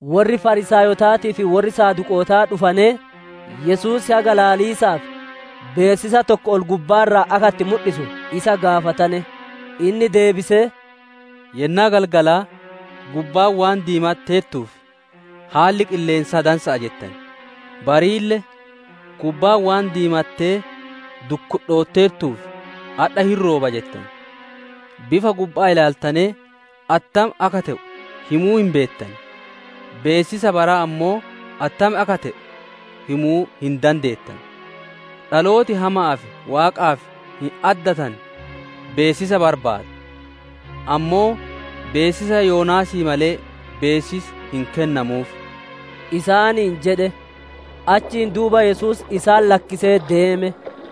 Worri Fariisaayotaatii fi worri Saduqootaa dhufanee, Yesuus haga ilaaliisaaf beessisa tokko ol-gubbaa irraa akka itti mudhisu isa gaafatane. Inni deebisee, «Yennaa galgalaa, ‹Gubbaan waan diimatteertuuf, haalli qilleensaa dansa'a› jettan; bariille, ‹Gubbaan waan diimattee dukkudhootteertuuf, adha hin rooba› jettan. Bifa gubba'aa ilaaltanee attam akka te'u himuu hin beettan, beessisa baraa ammoo attam akka te'u himuu hin dandeettanu. Dhalooti hama'aa fi Waaqaaf hin addatanne beessisa barbaada; ammoo beessisa Yoonaasii malee, beessisi hin kennamuuf» isaaniin jedhe. Achiin duuba Yesuus isaan lakkisee deeme.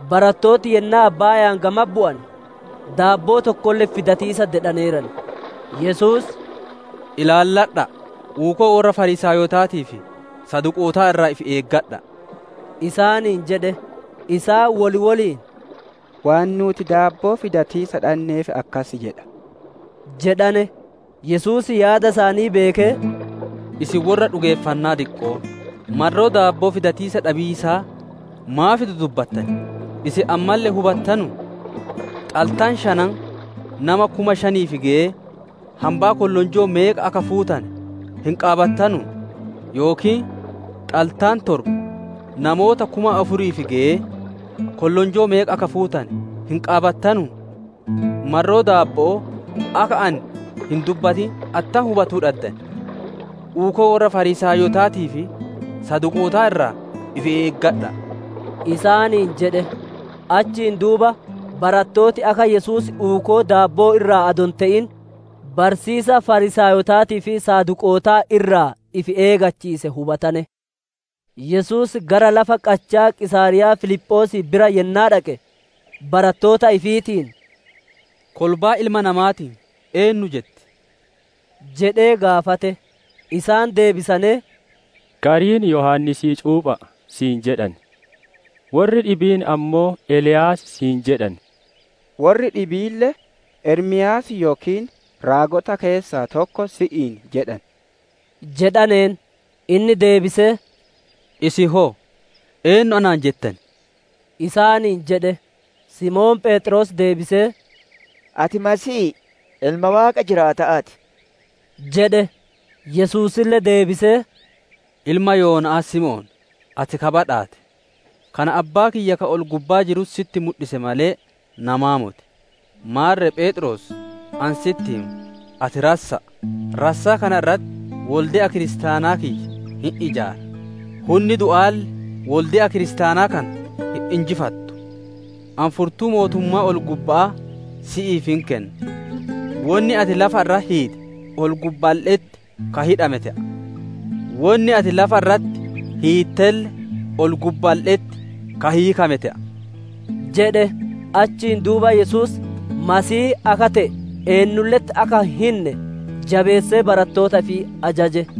Barattooti yennaa abbaaya'aan gamatti bu'ane, daabboo tokkolle fidatiisa dedhaneeran. Yesuus, «Ilaalladha'a! Uukoo worra Fariisaayotaatii fi Saduqootaa irraa ifi eegadha'a» isaaniin jedhe. Isaan wol woliin, «Waan nuuti daabboo fidatiisa dhanneef akkas jedha» jedhane. Yesuus yaada isaanii beekee, «Isin worra dhugeeffannaa diqqo'oo, marroo daabboo fidatiisa dhabiisaa maaf dudubbattan? Isin ammalle hin hubattanuu? Xaltaa shanan namoota kuma shaniif geyee, hambaa kollonjoo meeqa akka fuutane hin qaabattanuu? Yookiin xaltaa torba namoota kuma afuriif geyee kollonjoo meeqa akka fuutane hin qaabattanuu? Marroo daabbo'oo akka ani hin dubbatin attam hubatuu dhaddan? Uukoo worra Fariisaayotaatii fi Saduqootaa irraa ifi eegadha'a!» isaaniin jedhe. Achiin duuba barattooti akka Yesuus uukoo daabbo'oo irraa adoo hin te'in, barsiisa Fariisaayotaatii fi Saduqootaa irraa ifi eeggachiise hubatane. Yesuus gara lafa qachaa Qiisaariyaa Filiphoosii bira yennaa dhaqe, barattoota ifiitiin, «Kolbaan Ilma Namaatiin eennu jetti?» jedhee gaafate. Isaan deebisanee, «Gariin, ‹Yohaannisii cuupha'a› si'iin jedhan, worri dhibiin ammoo, ‹Eliyaas› si'iin jedhan, worri dhibiille, ‹Ermiyaas yookiin raagota keessaa tokko› si'iin jedhan» jedhaneen. Inni deebisee, «Isin hoo eennu anaan jettan?» isaaniin jedhe. Simoon Pheexroos deebisee, «Ati Masiihii, Ilma Waaqa jiraata'aa ti» jedhe. Yesuusille deebisee, «Ilma Yoona'aa Simoon, ati ka badhaate! Kana Abbaa kiyya ka ol-gubbaa jirutti sitti mudhise malee, namaa moti. Maarre Pheexroos, ani sitti hima, ati rassa'a; rassaa kana irratti wolde'a kiristaanaa kiyya hin ijaara; hunna du'aalle wolde'a kiristaanaa kana hin injifattu. Ani furtuu mootummaa ol-gubba'aa si'iif hin kenna, wonni ati lafa irratti hiite, ol-gubbaalle'etti ka hidhame te'a, wonni ati lafa irratti hiittelle ol-gubbaalle'etti ka hiikame te'a» jedhe. Achiin duuba Yesuus Masiihii akka te'e eennulle'etti akka hin hinne jabeessee barattoota ifii ajaje.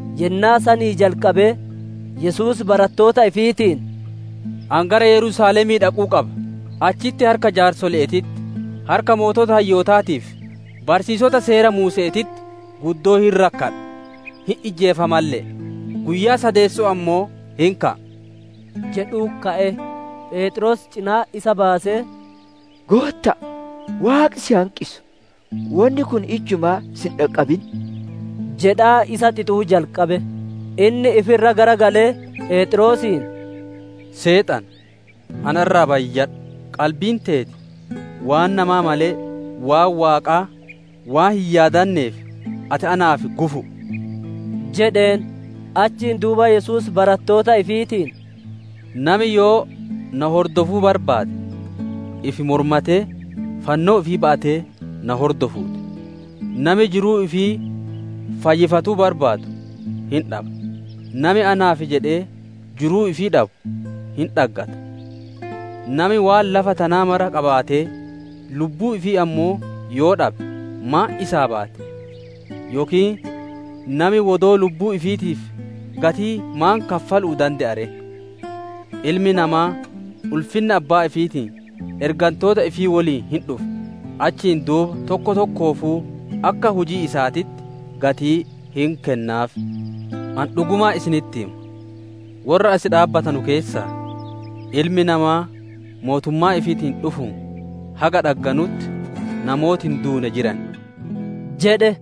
Yennaa sanii jalqabee Yesuus barattoota ifiitiin, «Ani gara Yerusaalemii dhaquu qaba; achitti harka jaarsole'eetitti, harka sooreyyii hayyootaatii fi barsiisota Seera Muuse'eetitti guddoo hin rakkadha, hin ijjeefamalle'e; guyyaa sadeesso'oo ammoo hin ka'a» jedhu'utti ka'e. Pheexroos cina'atti isa baasee, «Gootta'a, Waaqi si hanqisu! Wonni kun ijjumaa si hin dhaqqabin» jedhaa isa xixuu jalqabe. Inni ifi irra garagalee, Pheexroosiin, «Seexana, ana irraa bayyadhu! Qalbiin teeti waan namaa malee, waan Waaqaa waan hin yaadaneef, ati naaf gufu'u» jedheen. Achiin duuba Yesuus barattoota ifiitiin, «Nami yoo na hordofuu barbaade ifi mormatee, fannoo ifii ba'atee na hordofuu ti. Nami jiruu ifii fayyifatuu barbaadu hin dhaba; nami naaf jedhee jiruu ifii dhabu, hin dhaggata. Nami waan lafa tanaa mara qabaatee lubbuu ifii ammoo yoo dhabe maan isaa baati? Yookiin nami wodoo lubbuu ifiitiif gatii maan kaffalu'uu dande'a ree? Ilmi Namaa ulfinna Abbaa ifiitiin ergantoota ifii woliin hin dhufa; achiin duuba tokko tokkoofuu akka hujii isaatitti gatii hin kennaaf. Ani dhugumaan isinitti hima, worra as dhaabbatanu keessaa, Ilmi Namaa mootummaa ifiitiin dhufuun haga dhagganutti, namooti hin duune jiran» jedhe.